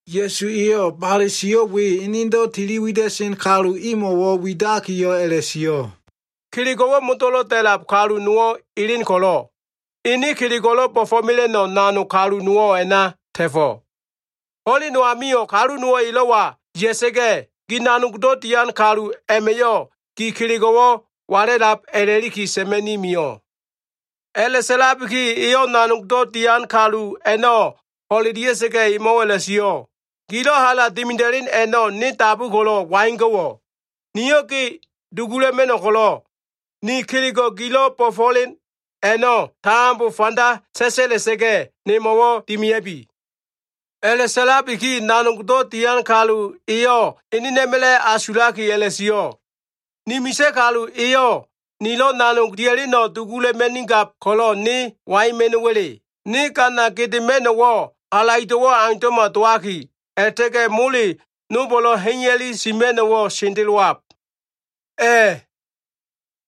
Ya꞉su eyo꞉ bale sio꞉ we enedo꞉ tiliwida꞉sen kalu imo꞉ widakiyo꞉ a꞉la꞉sio꞉, “Kelego꞉wo꞉ modo꞉lo꞉ da꞉lab kalu nowo꞉ elen ko꞉lo꞉, ene kelego꞉lo꞉ bo꞉fo꞉mela꞉no꞉ nanog kalu nowo꞉ a꞉na ta꞉fo꞉. Ho꞉len no amio꞉, kalu nowo꞉ elo꞉wa ya꞉sa꞉ga꞉yo꞉, gi nanogdo꞉ dian kalu a꞉ma꞉yo꞉ gi kelego꞉wo꞉ wala꞉lab a꞉la꞉liki sa꞉ma꞉ni mio꞉. A꞉la꞉sa꞉labiki eyo꞉ nanogdo꞉ dian kalu a꞉no꞉ ho꞉lelia꞉sa꞉ga꞉, emo꞉wo꞉ a꞉la꞉sio꞉. ‘Gilo꞉ hala dimida꞉len a꞉no꞉ ne dabu ko꞉lo꞉ waigo꞉wo꞉? Niyo꞉ ge dugula꞉ma꞉no꞉ ko꞉lo꞉, ne kelego꞉ gilo꞉ bo꞉fo꞉len a꞉no꞉ tambo fanda sa꞉sa꞉la꞉sa꞉ga꞉, nemo꞉wo꞉ dimia꞉bi.’ “A꞉la꞉sa꞉labiki nanogdo꞉ dian kalu eyo꞉ enena꞉ma꞉la꞉ asulaki a꞉la꞉sio꞉, ‘Ni misa꞉ kalu eyo꞉ nilo꞉ nanog dia꞉leno꞉ dugula꞉ma꞉nigab ko꞉lo꞉, ne waima꞉no꞉wa꞉le? Ne gana gedema꞉no꞉wo꞉ halaido꞉wo꞉ aundo꞉ma dowaki, a꞉la꞉ta꞉ga꞉ mole nolbo꞉lo꞉ ha꞉iya꞉li sima꞉no꞉wo꞉ sendelowab. A꞉,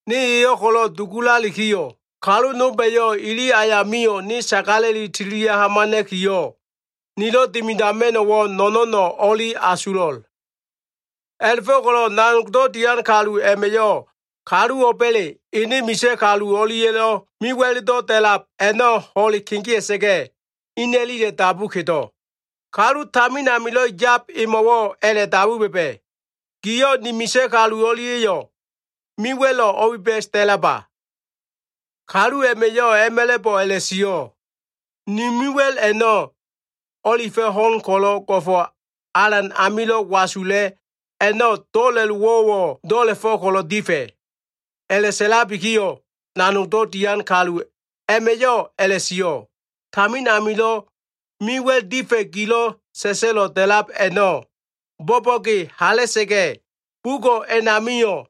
ne eyo꞉ ko꞉lo꞉ dugulalikiyo꞉, kalu nolba꞉yo꞉ ili ayamio꞉ ne sagala꞉li tililia꞉ hamana꞉kiyo꞉, nilo꞉ dimidama꞉no꞉wo꞉ no꞉no꞉no꞉ o꞉li asulo꞉l.’ A꞉la꞉fo꞉ko꞉lo꞉ nanogdo꞉ dian kalu a꞉ma꞉yo꞉ kalu o꞉ba꞉le ene misa꞉ kalu o꞉lia꞉lo꞉ mewa꞉ldo꞉ da꞉lab a꞉no꞉ ho꞉le kegea꞉sa꞉ga꞉, ina꞉lile dabu kedo꞉. Kalu tamin amilo꞉ yab emo꞉wo꞉ a꞉la꞉dabu ba꞉ba꞉, ‘Giyo꞉ ni misa꞉ kalu o꞉lia꞉yo꞉ me wa꞉lo꞉ o꞉biba꞉s da꞉laba?’ Kalu a꞉ma꞉yo꞉ a꞉ma꞉la꞉bo꞉ a꞉la꞉sio꞉, ‘Ni mewa꞉l a꞉no꞉, o꞉lifa꞉ ho꞉n ko꞉lo꞉ go꞉fo꞉ alan amilo꞉ wasula꞉ a꞉no꞉ do꞉la꞉lowo꞉wo꞉ do꞉la꞉fo꞉ ko꞉lo꞉ difa꞉.’ A꞉la꞉sa꞉labiyo꞉ nanogdo꞉ dian kalu a꞉ma꞉yo꞉ a꞉la꞉sio꞉, ‘Tamin amilo꞉ mewa꞉l difa꞉ gilo꞉ sa꞉sa꞉lo꞉ da꞉lab a꞉no꞉ bo꞉bo꞉ge hala꞉sa꞉ga꞉, bugo꞉ a꞉namio꞉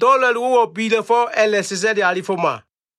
do꞉la꞉lowo꞉wo꞉ bila꞉fo꞉ a꞉la꞉sa꞉sa꞉li alifoma.’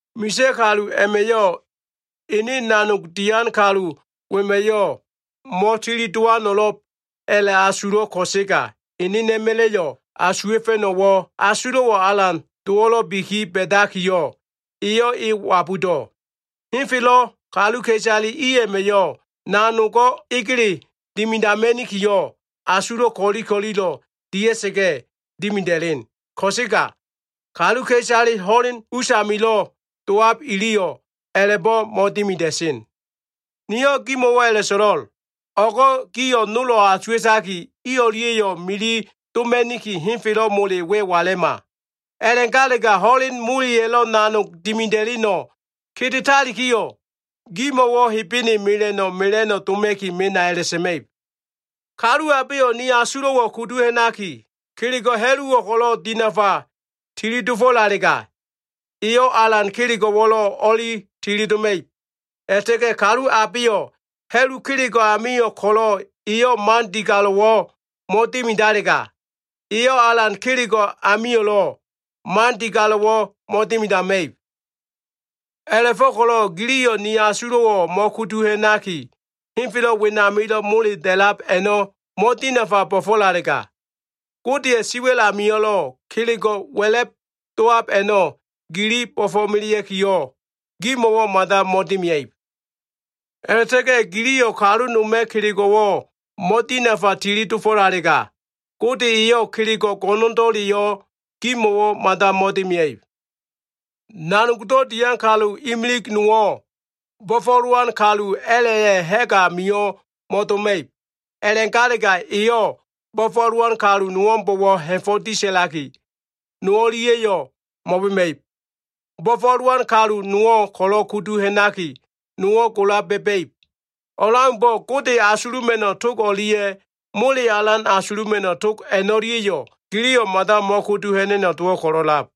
“Misa꞉ kalu a꞉ma꞉yo꞉ ene nanogdo꞉ dian kalu wema꞉yo꞉ mo꞉tilidowano꞉lo꞉b a꞉la꞉asulo꞉ ko꞉sega, enena꞉ma꞉la꞉lo꞉ asuwa꞉fa꞉no꞉wo꞉ asulo꞉wo꞉ alan dowo꞉lo꞉bi ba꞉dakiyo꞉, eyo꞉ e wabudo꞉. Henfelo꞉ kaluka꞉isale i a꞉ma꞉yo꞉ nanogo꞉ egele dimidama꞉nikiyo꞉, asulo꞉ ko꞉li ko꞉lilo꞉ dia꞉sa꞉ga꞉ dimida꞉len. Ko꞉sega kaluka꞉isale ho꞉len usamilo꞉ dowab iliyo꞉ a꞉la꞉bo꞉ mo꞉dimida꞉sen. Niyo꞉ gimo꞉wo꞉ a꞉la꞉so꞉lo꞉l. O꞉go꞉ gio꞉ nolo꞉ asuwa꞉taki, i o꞉lia꞉yo꞉ mili doma꞉niki, henfelo꞉ mole we wala꞉ma. A꞉la꞉galega ho꞉len moleya꞉lo꞉ nanog dimida꞉leno꞉ kedetalikiyo꞉, gimo꞉wo꞉ Hebene mela꞉no꞉ mela꞉no꞉ doma꞉ki mena a꞉la꞉sa꞉ma꞉ib. “Kalu abeyo꞉ ni asulo꞉wo꞉ kudu ha꞉naki, kelego꞉ ha꞉luwo꞉ ko꞉lo꞉ dinafa tili dofo꞉lalega, eyo꞉ alan kelego꞉wo꞉lo꞉ o꞉li tili doma꞉ib. A꞉la꞉ta꞉ga꞉ kalu abeyo꞉ ha꞉lu kelego꞉ amio꞉ ko꞉lo꞉, eyo꞉ man digalo꞉wo꞉ mo꞉dimidalega, eyo꞉ alan kelego꞉ amio꞉lo꞉ man digalo꞉wo꞉ mo꞉dimidama꞉ib. A꞉la꞉fo꞉ko꞉lo꞉ giliyo꞉ ne asulo꞉ a꞉no꞉ mo꞉kudu ha꞉naki, henfelo꞉ wenamilo꞉ mole da꞉lab a꞉no꞉ mo꞉dinafa bo꞉fo꞉lalega, Godeya꞉ siwa꞉l amilo꞉ kelego꞉ wa꞉la꞉b dowab a꞉no꞉ gili bo꞉fo꞉melea꞉kiyo꞉ gimo꞉wo꞉ mada mo꞉dimia꞉ib. A꞉la꞉ta꞉ga꞉ giliyo꞉ kalu noma꞉ kelego꞉wo꞉ mo꞉dinafa tili dofo꞉lalega, Gode eyo꞉ kelego꞉ go꞉no꞉ndo꞉leyo꞉ gimo꞉wo꞉ mada mo꞉dimia꞉ib. “Nanogdo꞉ dian kalu imili nowo꞉ bo꞉fo꞉lowan kalu a꞉la꞉ya꞉ ha꞉g amio꞉ mo꞉doma꞉ib. A꞉la꞉galega, eyo꞉ bo꞉fo꞉lowan kalu nowo꞉mbo꞉wo꞉ ha꞉fo꞉ disa꞉laki, no o꞉lia꞉yo꞉ mo꞉bema꞉ib. Bo꞉fo꞉lowan kalu nowo꞉ ko꞉lo꞉ kudu ha꞉naki, nowo꞉ gola ba꞉ba꞉ib. O꞉leaumbo꞉ Gode asuluma꞉no꞉ tog o꞉lia꞉ mole alan asuluma꞉no꞉ tog a꞉no꞉lia꞉yo꞉ giliyo꞉ mada mo꞉kudu ha꞉na꞉no꞉ dowo꞉ ko꞉lo꞉lab.”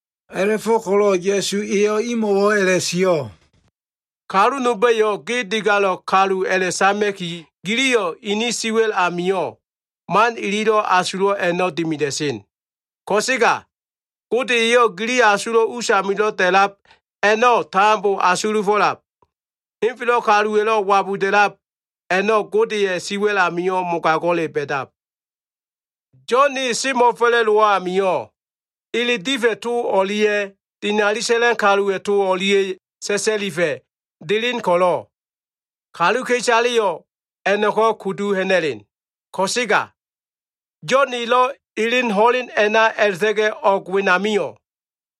A꞉la꞉fo꞉ko꞉lo꞉ Ya꞉su eyo꞉ imo꞉wo꞉ a꞉la꞉sio꞉, “Kalu nolba꞉yo꞉ ge digalo꞉ kalu a꞉la꞉sama꞉ki, giliyo꞉ ini siwa꞉l amio꞉ man ililo꞉ asulo꞉ a꞉no꞉ dimida꞉sen. Ko꞉sega, Gode eyo꞉ gili asulo꞉ usamilo꞉ da꞉lab a꞉no꞉ tambo asulufo꞉lab. Henfelo꞉ kaluwa꞉lo꞉ wabuda꞉lab a꞉no꞉, Godeya꞉ siwa꞉l amio꞉ mogago꞉le ba꞉dab. “Yo꞉n e semo꞉fa꞉la꞉dowo꞉ amio꞉, ele difa꞉ to o꞉lia꞉ dinali sa꞉lan kaluwa꞉ to o꞉lia꞉yo꞉ sa꞉sa꞉lifa꞉ delen ko꞉lo꞉, kaluka꞉isaleyo꞉ a꞉no꞉ko꞉ kudu ha꞉na꞉len. Ko꞉sega Yo꞉n elo꞉ elen ho꞉len a꞉na a꞉la꞉ta꞉ga꞉ o꞉g wenamio꞉,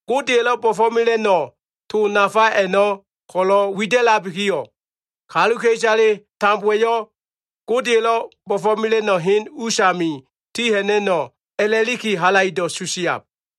Godeya꞉lo꞉ bo꞉fo꞉mela꞉no꞉ to nafa a꞉no꞉ ko꞉lo꞉ wida꞉labikiyo꞉, kaluka꞉isale tambowa꞉yo꞉ Godeya꞉lo꞉ bo꞉fo꞉mela꞉no꞉ hen usami ti ha꞉na꞉no꞉ a꞉la꞉liki halaido꞉ susiab.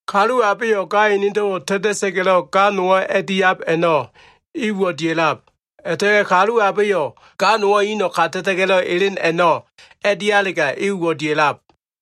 “Kalu abeyo꞉ ga enedo꞉wo꞉ ta꞉ta꞉sa꞉ga꞉lo꞉ ga nowo꞉ a꞉diab a꞉no꞉, e uwo꞉ dia꞉lab. A꞉la꞉ta꞉ga꞉ kalu abeyo꞉ ga nowo꞉ ino꞉ kata꞉ta꞉ga꞉lo꞉ elen a꞉no꞉ a꞉dialega, e uwo꞉ dia꞉lab.”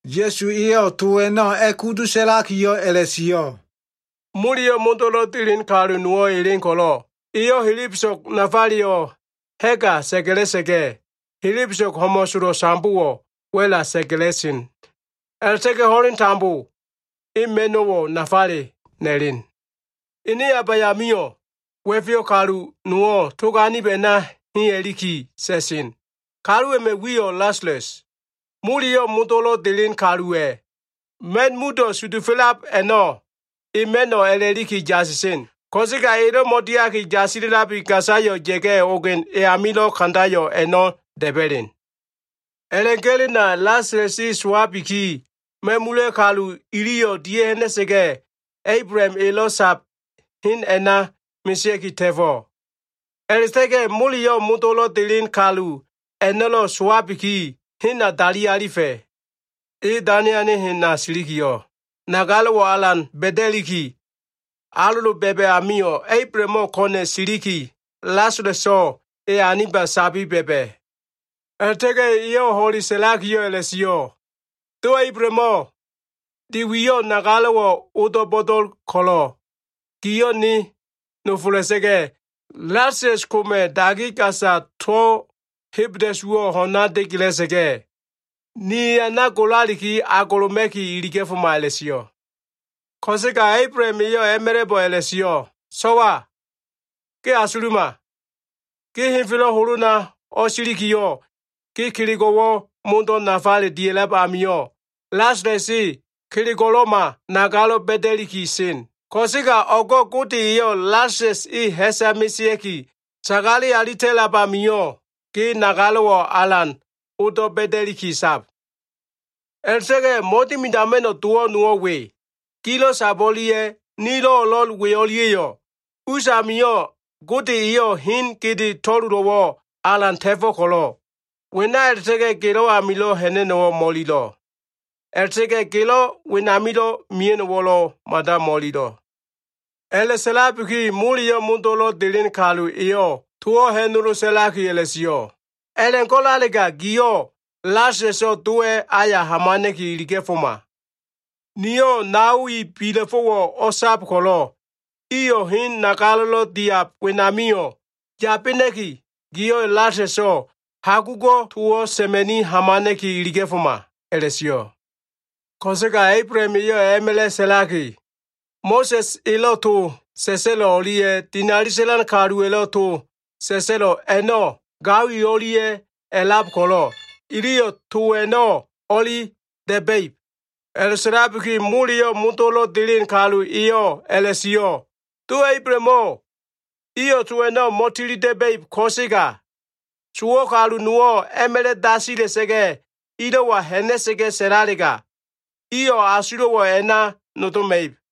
Ya꞉su eyo꞉ to a꞉no꞉ a꞉kudu sa꞉lakiyo꞉ a꞉la꞉sio꞉, “Moleyo꞉ modo꞉lo꞉ delen kalu nowo꞉ elen ko꞉lo꞉, eyo꞉ helebeso꞉g nafaleyo꞉ ha꞉ga sa꞉ga꞉la꞉sa꞉ga꞉, helebeso꞉g ho꞉mo꞉solo꞉ sambowo꞉ wa꞉la sa꞉ga꞉la꞉sen. A꞉la꞉ta꞉ga꞉ ho꞉leno꞉ tambo e ma꞉no꞉wo꞉ nafale na꞉len. Ene abayamio꞉ wa꞉feyo꞉ kalu nowo꞉ tog anib a꞉na ha꞉iya꞉liki sa꞉sen. Kalu a꞉ma꞉ wiyo꞉ Lasalas. Moleyo꞉ modo꞉lo꞉ delen kaluwa꞉ ma꞉n mudo꞉ sudufa꞉lab a꞉no꞉ e ma꞉no꞉ a꞉la꞉liki yasisen. Ko꞉sega elo꞉ mo꞉diaki yasila꞉labi, gasayo꞉ ya꞉ga꞉ ogen e amilo꞉ kandayo꞉ a꞉no꞉ da꞉ba꞉len. “A꞉la꞉ga꞉lena, Lasalas e sowabiki, ma꞉mula꞉ kalu iliyo꞉ dia꞉ha꞉na꞉sa꞉ga꞉, Ablaham elo꞉ sab hen a꞉na mesea꞉ki ta꞉fo꞉. A꞉la꞉ta꞉ga꞉ moleyo꞉ modo꞉lo꞉ delen kalu a꞉no꞉lo꞉ sowabiki, hena dali alifa꞉. E dane ane hena silikiyo꞉, nagalo꞉wo꞉ alan ba꞉da꞉liki, alolo ba꞉ba꞉ amio꞉, Ablahamo꞉ ko꞉na꞉ siliki, Lasalaso꞉ e aniba sabi ba꞉ba꞉. A꞉la꞉ta꞉ga꞉ eyo꞉ ho꞉le sa꞉lakiyo꞉ a꞉la꞉sio꞉, ‘Do Ablahamo꞉, de wiyo꞉ nagalo꞉wo꞉ odo꞉ bo꞉do꞉l ko꞉lo꞉, giyo꞉ ne nofola꞉sa꞉ga꞉, Lasalas koma꞉ dagi gasa to꞉ hebda꞉suwo꞉ ho꞉na degela꞉sa꞉ga꞉, ne eana golaliki agoloma꞉ki iliga꞉foma’ a꞉la꞉sio꞉. “Ko꞉sega Ablaham eyo꞉ a꞉ma꞉la꞉bo꞉ a꞉la꞉sio꞉, ‘So꞉wa, ge asuluma. Ge henfelo꞉ holona o꞉silikiyo꞉, ge kelego꞉wo꞉ modo꞉ nafale dia꞉lab amio꞉, Lasalas e kelego꞉lo꞉ma nagalo꞉ ba꞉da꞉liki sen. Ko꞉sega o꞉go꞉ Gode eyo꞉ Lasalas e ha꞉sa mesea꞉ki sagale alita꞉lab amio꞉, ge nagalo꞉wo꞉ alan odo꞉ ba꞉da꞉liki sab. A꞉la꞉ta꞉ga꞉ mo꞉dimidama꞉no꞉ dowo꞉ nowo꞉ we. Gilo꞉ sab o꞉lia꞉ nilo꞉ o꞉lo꞉l we o꞉lia꞉yo꞉ us amio꞉ Gode eyo꞉ hen gede to꞉lolo꞉wo꞉ alan ta꞉fo꞉ ko꞉lo꞉, wena a꞉la꞉ta꞉ga꞉ gelo꞉ amilo꞉ ha꞉na꞉no꞉wo꞉ mo꞉ililo꞉, a꞉la꞉ta꞉ga꞉ gelo꞉ wenamilo꞉ mia꞉no꞉wo꞉lo꞉ mada mo꞉ililo꞉.’ “A꞉la꞉sa꞉labiki, moleyo꞉ modo꞉lo꞉ delen kalu eyo꞉ towo꞉ ha꞉nolo sa꞉laki a꞉la꞉sio꞉, ‘A꞉la꞉go꞉lalega giyo꞉ Lasalaso꞉ dowa꞉ aya hamana꞉ki iliga꞉foma. Niyo꞉ nao i bila꞉fo꞉wo꞉ o꞉sab ko꞉lo꞉, iyo꞉ hen nagalo꞉lo꞉ diab wenamio꞉ yabena꞉ki, giyo꞉ Lasalaso꞉ hagugo꞉ towo꞉ sa꞉ma꞉ni hamana꞉ki iliga꞉foma’ a꞉la꞉sio꞉. Ko꞉sega Ablaham eyo꞉ a꞉ma꞉la꞉ sa꞉laki, ‘Mo꞉sa꞉s elo꞉ to sa꞉sa꞉lo꞉ o꞉lia꞉ dinali sa꞉lan kaluwa꞉lo꞉ to sa꞉sa꞉lo꞉ a꞉no꞉ gao i o꞉lia꞉ a꞉lab ko꞉lo꞉ iliyo꞉ to a꞉no꞉ o꞉li da꞉ba꞉ib.’ A꞉la꞉sa꞉labiki, moleyo꞉ modo꞉lo꞉ delen kalu eyo꞉ a꞉la꞉sio꞉, ‘Do Ablahamo꞉, iyo꞉ to a꞉no꞉ mo꞉tilida꞉ba꞉ib ko꞉sega, sowo꞉ kalu nowo꞉ a꞉ma꞉la꞉ dasila꞉sa꞉ga꞉ ilo꞉wa ha꞉na꞉sa꞉ga꞉ sa꞉lalega, iyo꞉ asulo꞉wo꞉ a꞉na nodoma꞉ib.’